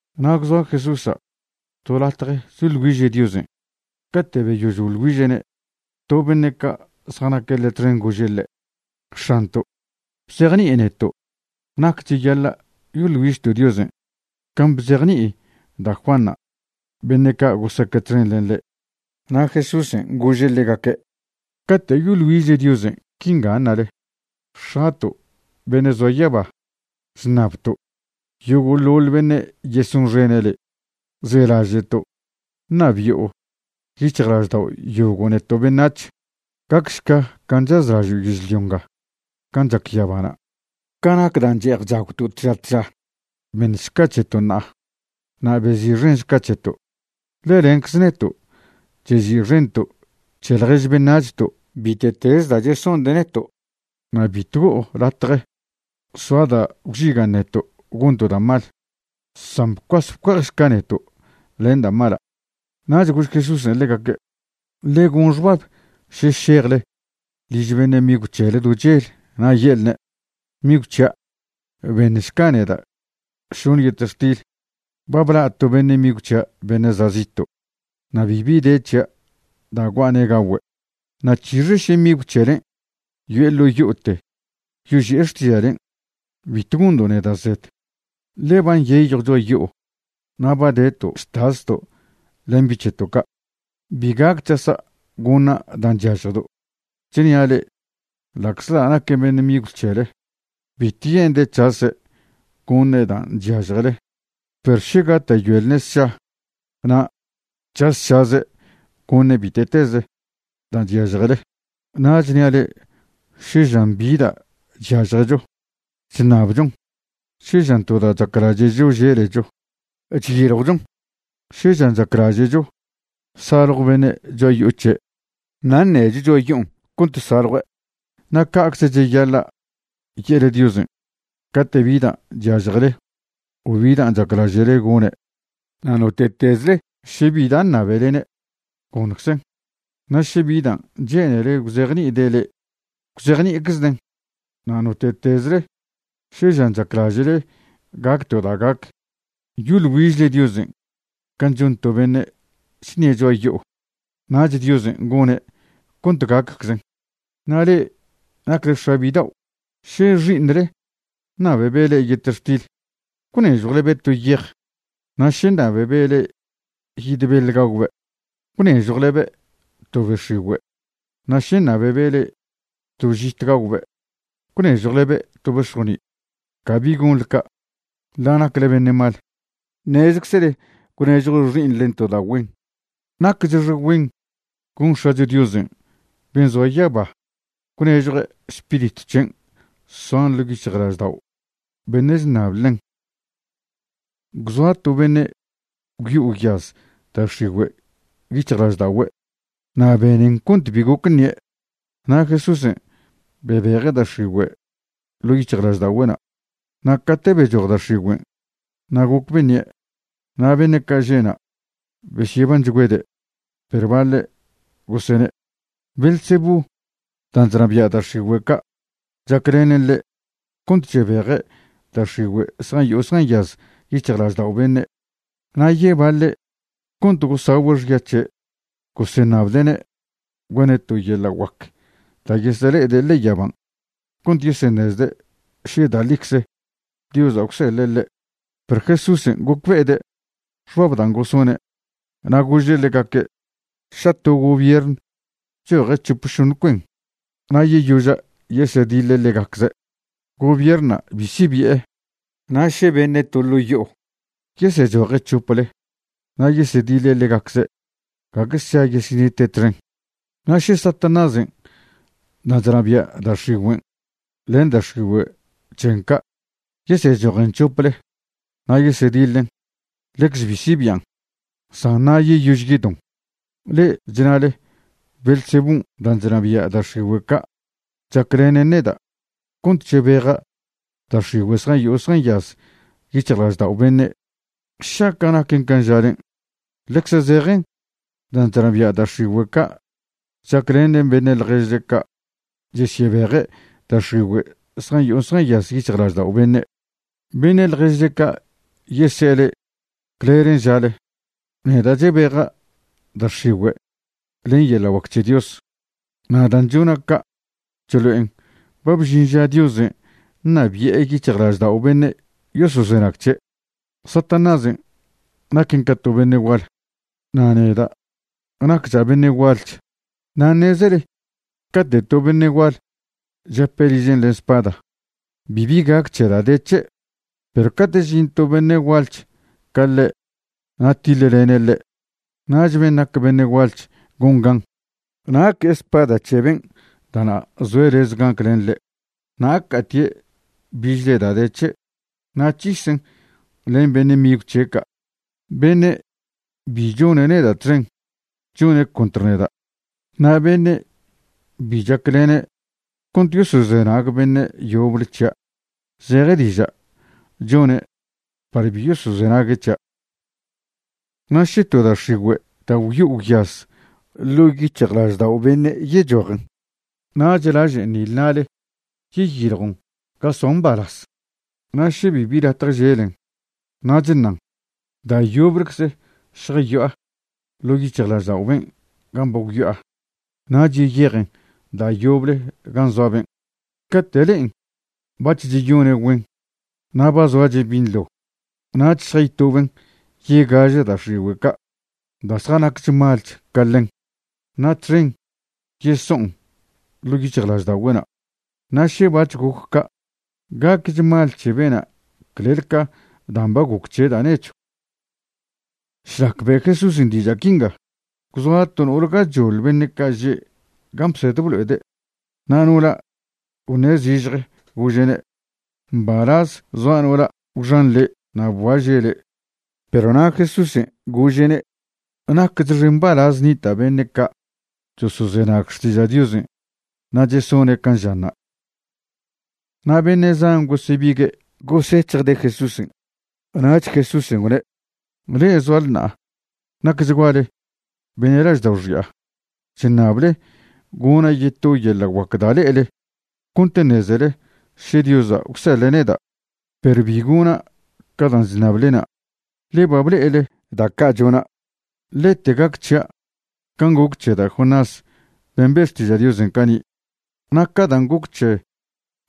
Na' gwzoa Jesúsa' to latje choḻ güiže' Diosen'. Cate' beyož boḻ güiže'ne' to beṉe' ca' zjanaque' ḻe' txen gože' ḻe': ―X̱anto', bzejni'i neto' nac cheyaḻa' yoḻ güižto' Diosen', can' bzejni'i da' Juanṉa' beṉe' ca' gosaque' txen ḻen ḻe'. Na' Jesúsen' gože' ḻegaque': ―Cate' yoḻ güižle Diosen', quinga ṉale: X̱ato' beṉe' zoa yaba, chṉabto' yogo'ḻoḻ beṉe' yesonxene' le'. Zelaže'to' ṉabi'o yic̱hjlaždao' yogo' neto' beṉac̱h. Gacšca can' chazlažo' yežlio nga can' chac yabana'. Ca nac dan' che'ej chagwto' tža tža, beṉšca c̱heto' ṉa'a. Na' bezi'xenšca c̱heto', ḻe lencze neto' chezi'xento' c̱he ḻjež beṉac̱hto' bite'tez da' chesonde' neto'. Na' bitw go'o latje soa da' gwžigan' neto' gonto' da' mal, san bcuase bcue'ejšca neto' len da' mala'. Nach gož Jesúsen' ḻegaque': ―Ḻe gon xbab še šejle liž beṉe' migw c̱hele do chel na' ye'lne': “Migw c̱hia', beṉšca neda' šoṉe yetextil. Ba bla' to beṉe' migw c̱hia' beṉe' za' zito', na' bibi de c̱hia' da' gua'ane' gagüe'.” Na' c̱hixe še migw c̱helen' yo'e ḻo' yo'ote yoži'e xtiža'len': “Bitw gondo' neda' zed, ḻe ba nyeyjw cho'a yo'o na' ba deto' chtasto' len bi' c̱heto' ca'. Bi gac c̱hasa' goṉa' dan' chyažjdo'.” Chnia' le'e, ḻa'czḻa' naque' migw c̱hele, bitw ye'nde' c̱hase' goṉe' dan' chyažjele, perw še gata'yoelne' sša na' c̱hasšaze' goṉe' bite'tez da' chyažjele. Na' chnia' le'e, še žan bi da' chyažjecho, chṉabchon. Še žan to da' chaclaže'cho želecho, chyiljwchon. Še žan chaclaže'cho saljw beṉe' cho'a yo'o c̱he', na' ṉecho cho'a yo'on cont saljue'. Na' ca'cze cheyaḻa' ye'le Diosen' cate' bi da' chyažjele o bi da' chaclaže'le gone'. Na' note'tezle še bi da' ṉabelene', goṉczen'. Na' še bi dan' che'nele gwzejni'ide' le'e, gwzejni'iczden'. Na' note'tezle še žan chaclaže'le gac to da' gac, yoḻ güižle Diosen' can' chon to beṉe' chṉie' cho'a yo'o, nach Diosen' gone' cont gacczen. ’Na' le'e nacle x̱a bidao', še xi'iṉle ṉabebe' le'e yetextil, ¿gwnežjwlebe' to yej? Na' še ṉabebe' le'e yid beḻ gagwbe' ¿gwnežjwlebe' to be x̱igüe'? Na' še ṉabebe' le'e to žit gagwbe' ¿gwnežjwlebe' to bex̱joni'? Cabi gonḻe ca'. Ḻa' nacle beṉe' mal, ṉezczele gwnežjo xi'iṉle to da' güen. Nacchxe güen gon X̱acho Diosen' ben' zoa yaba gwnežjue' Spiritw c̱hen' soan ḻo' yic̱hjlaždao' beṉe' chṉab ḻen. Gwzoa to beṉe' gwyo'o gwyaz da' x̱igüe' yic̱hjlažda'ogüe' na' benen cont bi goc ṉie'. Na' Jesúsen' bebeje' da' x̱igüe' ḻo' yic̱hjlažda'ogüe'na'. Na' cate' bechoj da' x̱igüen', na' goc beṉie'. Na' beṉe' ca' že'na' besyebanchgüede'. Perw baḻe' gosene': ―Beelzebú dan' chnabia' da' x̱igüe' ca' chaclenen ḻe' cont chebeje' da' x̱igüe' zjayo'o zjanyaz yic̱hjlaždao' beṉe'. Na' yebaḻe' cont gosagüe' xya c̱he' goseṉabde'ne' gone' to yeḻa' guac da' yesele'ede' ḻe'e yaban' cont yeseṉezde' še da' ḻicze Diosa' gwseḻe' ḻe'. Perw Jesúsen' gocbe'ede' xbab dan' gosone', na' gože' ḻegaque': ―Ša to gobiern choje' c̱hop šoṉ cuen na' yeyoža' yesediḻe' ḻegacze', gobiernṉa' bi sibi'e. Na' še beṉe' to ḻo' yo'o yesechoje' c̱hople na' yesediḻe' ḻegacze', gague sša yesenite' txen. Na' še Satanásen' dan' chnabia' da' x̱igüen' len da' x̱igüe' c̱hen ca' yesechojen c̱hople na' yesediḻen, ḻecze bi sibian', san na' yeyož yedon. Le'e chnale Beelzebún' dan' chnabia' da' x̱igüe' ca' chaclenen neda' cont chebeja' da' x̱igüe' zjayo'o zjanyaz yic̱hjlaždao' beṉe'. Šaca' naquen can' žalen', ḻecze zejen dan' chnabia' da' x̱igüe' ca' chaclenen beṉe' ḻježle ca' chesyebeje' da' x̱igüe' zjayo'o zjanyaz yic̱hjlaždao' beṉe'. Beṉe' ḻježle ca' yese'e le'e clelen' žale. Neda' chebeja' da' x̱igüe' len yeḻa' guac c̱he Dios, na' dan' chona' ca' chlo'en ba bžin ža Diosen' ṉabi'e yic̱hjlaždao' beṉe' yosozenag c̱he'. ’Satanásen' naquen ca to beṉe' gual, na' neda' naccha' beṉe' gualch. Na' ṉezele cate' to beṉe' gual chape' ližen' len spada, bibi gac c̱he da' de c̱he'. Perw cate' žin to beṉe' gualch ca ḻe' na' tiḻlene' ḻe', nach ben' nac beṉe' gualch gon gan. Na' que'e spada c̱he ben' da'na' zoe' lez gaclen ḻe' na' ca'atie' bichle da' de c̱he' na' c̱hisen' len beṉe' migw c̱he' ca'. ’Beṉe' bi chone' neda' txen, chone' contr neda'. Na' beṉe' bi chaclene' cont yosozenag beṉe' yoble c̱hia', zeje diža' chone' par bi yosozenague' c̱hia'. ’Na' še to da' x̱igüe' da' gwyo'o gwyaz ḻo' yic̱hjlaždao' beṉe' yechojen, nach lažen nile na'le yeyiljon ga soan mbalaz. Na' še bibi latje želen, nach ṉan: “Da' yoblecze šjayo'a ḻo' yic̱hjlaždao' ben' gan' ba gwyo'a.” Nach yeyejen da' yoble gan' zoa ben'. Cate' le'en bac̱h cheyone' güen, na' ba zoache' binḻo, nach šjaytoben yegaže da' x̱igüe' ca' da' zjanacch malech ca ḻen, na' txen yeso'on ḻo' yic̱hjlažda'ogüe'na'. Na' še bac̱h goc ca', gacch mal c̱he bena' clel ca dan' ba goc c̱he' da' nechw. Šlac be' Jesúsen' diža' quinga, gwzoa to no'ole gachoḻ beṉe' ca' že' gan' bsed blo'ede', na' no'ola' gwṉe' zižje, gože'ne': ―Mbalaz zoa no'ola' gwxan le' na' bguaže' le'. Perw na' Jesúsen' gože'ne': ―Nacchxe mbalaz nita' beṉe' ca' chosozenag xtiža' Diosen' na' chesone' can' žanna'. Na' beṉe' zan gosebigue' gosec̱hjde' Jesúsen', nach Jesúsen' gwne': ―Le'e zoale ṉa'a nacchguale beṉe' laždao' xi'a. Chṉable gona' yeto yeḻa' guac da' le'ele cont ṉezele še Diosa' gwseḻe' neda', perw bi gona' ca dan' chṉablena', le ba ble'ele da' ca' chona'. Lete gac c̱hia' can' goc c̱he da' Jonás ben' be' xtiža' Diosen' cani'. Na' ca dan' goc c̱he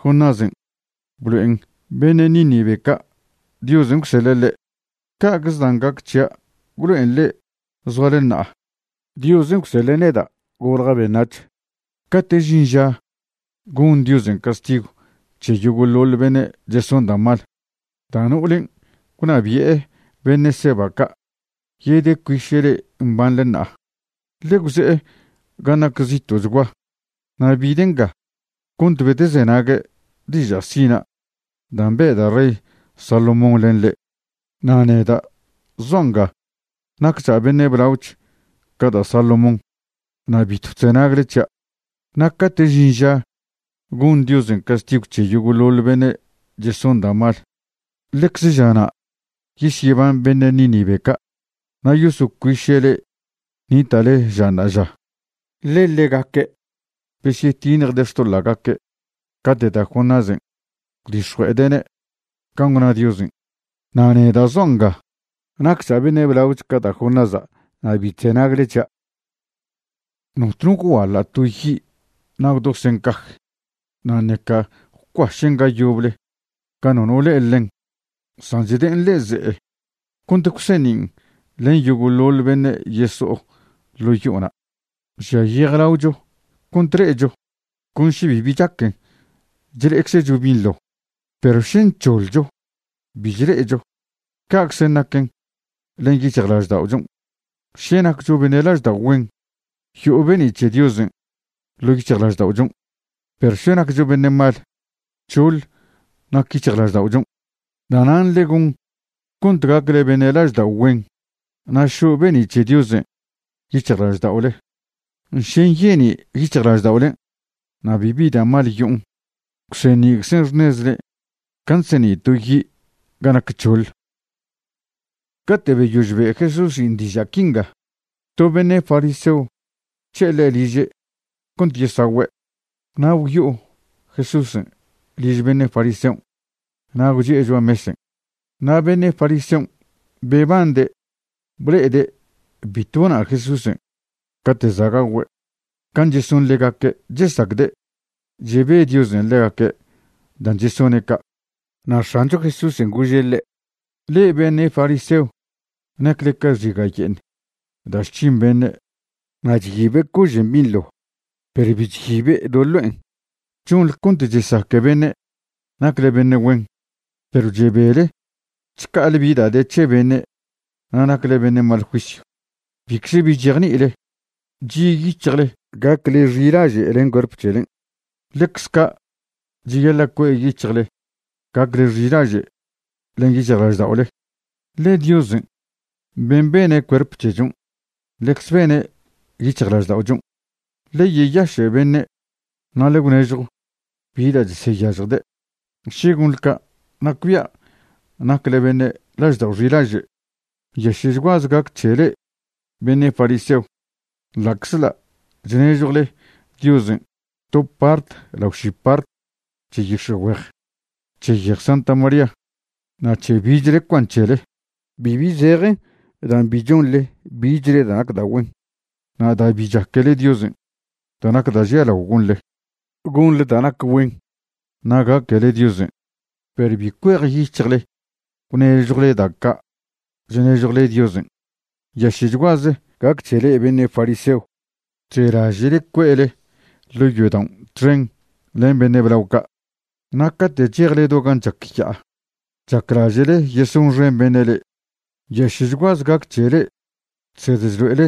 Jonásen' blo'en beṉe' Níneve ca' Diosen' gwseḻe' ḻe', ca'cze dan' gac c̱hia' gwlo'en le'e zoale ṉa'a Diosen' gwseḻe' neda' golja' beṉac̱h. Cate' žin ža gon Diosen' castigw c̱he yogo'ḻoḻ beṉe' cheson da' mal, da' no'olen' gwnabi'e beṉe' Seba ca' yedecuiše' le'e mbanḻe ṉa'a. Ḻe' gwze'e gan' nac zito'chgua na' bide' nga cont bedezenague' diža' sina' dan' be' da' rey Salomón len ḻe', na' neda' zoa' nga naccha' beṉe' blaoch ca da' Salomón na' bitw chzenagle c̱hia'. Na' cate' žin ža gon Diosen' castigw c̱he yogo'ḻoḻ beṉe' cheson da' mal, ḻecze žana' yesyeban beṉe' Nínive ca' na' yosocuiše' le'e nita'le ža ṉa'aža. Ḻe ḻegaque' besyetiṉjde' xtoḻa'gaque' cate' da' Jonásen' gwdix̱jue'ede'ne' can' gwna Diosen'. Na' neda' zoa' nga naccha' beṉe' blaoch ca da' Jonása' na' bi chzenagle c̱hia'. ’Notno gwguaḻa' to yi' na' gwdosen' caj, na' ṉeca gwcuašen' ga yoble ga nono le'e ḻen, san chde'en ḻe'e ze'e cont gwseṉin' len yogo'ḻoḻ beṉe' yeso'o ḻo' yo'ona'. Žia yejlaocho cont le'echo. Con še bibi chaquen chle'eczecho binḻo. Perw še nc̱hoḻcho, bi chle'echo. Ca'czen' naquen len yic̱hjlažda'ochon'. Še naccho beṉe' laždao' güen, yo'o be'ni' c̱he Diosen' ḻo' yic̱hjlažda'ochon'. Perw še naccho beṉe' mal, c̱hoḻ nac yic̱hjlažda'ochon'. Da'nan' ḻe gon cont gacle beṉe' laždao' güen, na' šo' be'ni' c̱he Diosen' yic̱hjlažda'ole. Še nyeni' yic̱hjlažda'olen' na' bibi da' mal yo'on, gwseṉi'czen xṉezle can' chseṉi' to yi' ga nac c̱hoḻ. Cate' beyož be' Jesúsen' diža' quinga, to beṉe' fariseo gwc̱he'e ḻe' liže' cont yesagüe'. Na' gwyo'o Jesúsen' liž beṉe' fariseon' na' gwchi'e cho'a mesen'. Na' beṉe' fariseon' bebande' ble'ede' bitw bona' Jesúsen' cate' za' gagüe' can' cheson ḻegaque' chesacde' chebe Diosen' ḻegaque' dan' chesone' ca'. Na' X̱ancho Jesúsen' gože' ḻe': ―Le'e beṉe' fariseo nacle ca xiga' ye'eṉ da' chc̱hin beṉe' na' chyibe' cožen' binḻo perw bi chyibe' do ḻo'en. Chonḻe cont chesaque beṉe' nacle beṉe' güen, perw chebele chca'ale bi da' de c̱he beṉe' na' nacle beṉe' mal juisyw. Bicze bi chejni'ile. Chi' yic̱hjle gacle xilaže' len cuerp c̱helen'. Ḻecz ca' cheyaḻa' cue' yic̱hjle gacle xilaže' len yic̱hjlažda'ole, ḻe Diosen' ben' bene' cuerp c̱hechon' ḻecze bene' yic̱hjlažda'ochon'. Ḻe yeyaše' beṉe' na' ḻe gwnežjo bi da' cheseyažjde'. Še gonḻe ca', nacbia' nacle beṉe' laždao' xilaže'. ’¡Nyaše'chguaze gac c̱he le'e beṉe' fariseo! Ḻa'czḻa' chnežjwle Diosen' to part lao ši part c̱he yix̱e'güej, c̱he yej Santa María, na' c̱he bichle cuan c̱hele, bibi zejen dan' bi chonḻe bichle da' nac da' güen, na' da' bi chaquele Diosen'. Da' nac da' žialao gonḻe, gonḻe da' nac güen na' gaquele Diosen'. Perw bi cuejyic̱hjle gwnežjwle da' ca' chnežjwle Diosen'. ’¡Nyaše'chguaze gac c̱he le'e beṉe' fariseo! Chzelaže'le cue'le ḻo' yodao' txen len beṉe' blao ca', na' cate' chejle do gan' chac ya'a chaclaže'le yesonxen beṉe' le'e. ’¡Nyaše'chguaze gac c̱he le'e chsed chlo'ele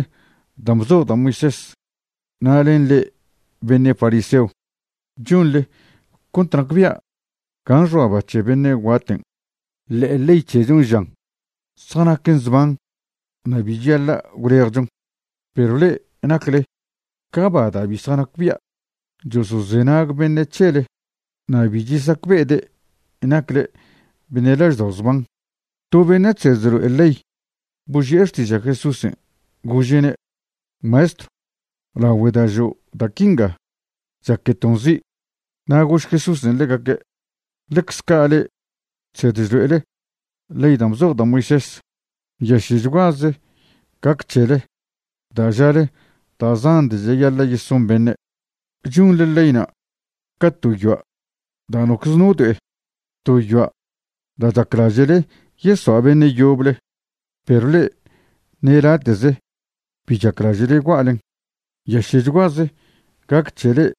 da' bzoj da' Moisés na' len le'e beṉe' fariseo! Chonḻe cont nacbia' gan' xoa ba c̱he beṉe' guaten', ḻe ley c̱hechon' žan zjanaquen zban na' bi cheyaḻa' gwlejchon. Perw le'e nacle ca ba da' bi zjanacbia'. Chosozenag beṉe' c̱hele na' bi chesacbe'ede' nacle beṉe' laždao' zban. To beṉe' chsed chlo'e ley boži'e xtiža' Jesúsen', gože'ne': ―Maestrw, lagüe da' žo' da' quinga, chaqueton' zi'. Na' gož Jesúsen' ḻegaque': ―Ḻecze ca' le'e chsed chlo'ele ley da' bzoj da' Moisés, ¡nyaše'chguaze gac c̱hele! Da' žale da' zan da' cheyaḻa' yeson beṉe', chonḻe leyna' ca to yoa' da' nocze no do'e, to yoa' da' chaclaže'le yesoa' beṉe' yoble, perw le'e ṉe late'ze bi chaclaže'le gua'len. ’¡Nyaše'chguaze gac c̱he le'e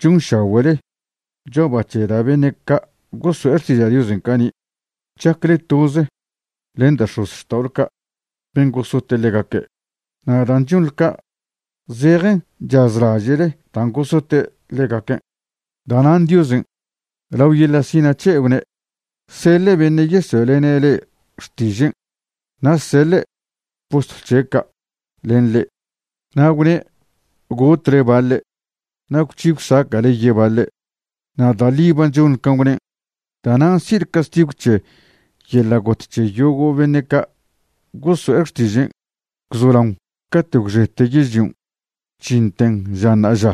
chonšagüe'le cho'a ba c̱he da' beṉe' ca' gosoe' xtiža' Diosen' cani'! Chacle toze len da' x̱ozxta'ole ca' ben' gosote' ḻegaque'. Na' dan' chonḻe ca', zejen chazlaže'le dan' gosote' ḻegaquen'. ’Da'nan' Diosen' lao yeḻa' sina' c̱he' gwne' seḻe' beṉe' yesoe'lene' le'e xtižen' na' seḻe' postlw c̱he' ca' len le'e. Na' gwne' gotle baḻe' na' gwc̱hi gwsaca'le yebaḻe'. Na' da' ḻi ba chonḻe can' gwnen'. Da'nan' si'le castigw c̱he yeḻa' got c̱he yogo' beṉe' ca' gosoe' xtižen' gwzolaon caten' gwxete yežlion' chžinten ža ṉa'aža.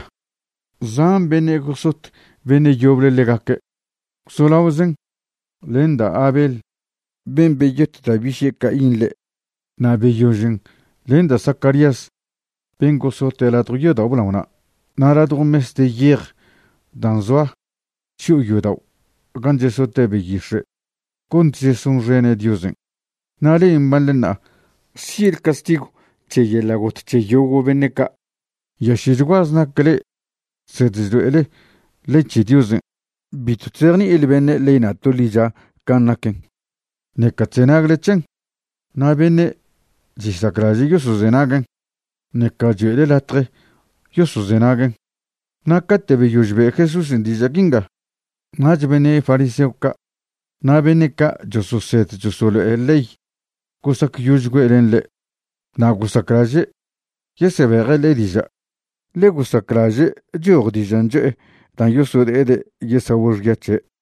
Zan beṉe' gosot beṉe' yoble ḻegaque' gwzolaozen len da' Abel ben' beyot da' biše' Caín ḻe', na' beyožen len da' Zacarías ben' gosote' ladjo yodao' blaona' na' ladjo mes de yej dan' zoa chyo'o yodao' gan' chesote' beyix̱e' cont chesonxene' Diosen'. Na' le'e mbanḻe ṉa'a si'le castigw c̱he yeḻa' got c̱he yogo' beṉe' ca'. ’¡Nyaše'chguaze nac le'e chsed chlo'ele ley c̱he Diosen'! Bitw chzejni'ile beṉe' leyna' to ḻicha can' naquen, ṉeca chzenagle c̱hen. Na' beṉe' chesaclaže' yosozenaguen', ṉeca choe'le latje yosozenaguen'. Na' cate' beyož be' Jesúsen' diža' quinga, nach beṉe' fariseo ca' na' beṉe' ca' chososed chosolo'e ley gosacyožchgüe' len ḻe'. Na' gosaclaže' yesebeje' ḻe' diža' ḻe gosaclaže' choj dižan' cho'e da' yosode'ede' yesagüe' xya c̱he'.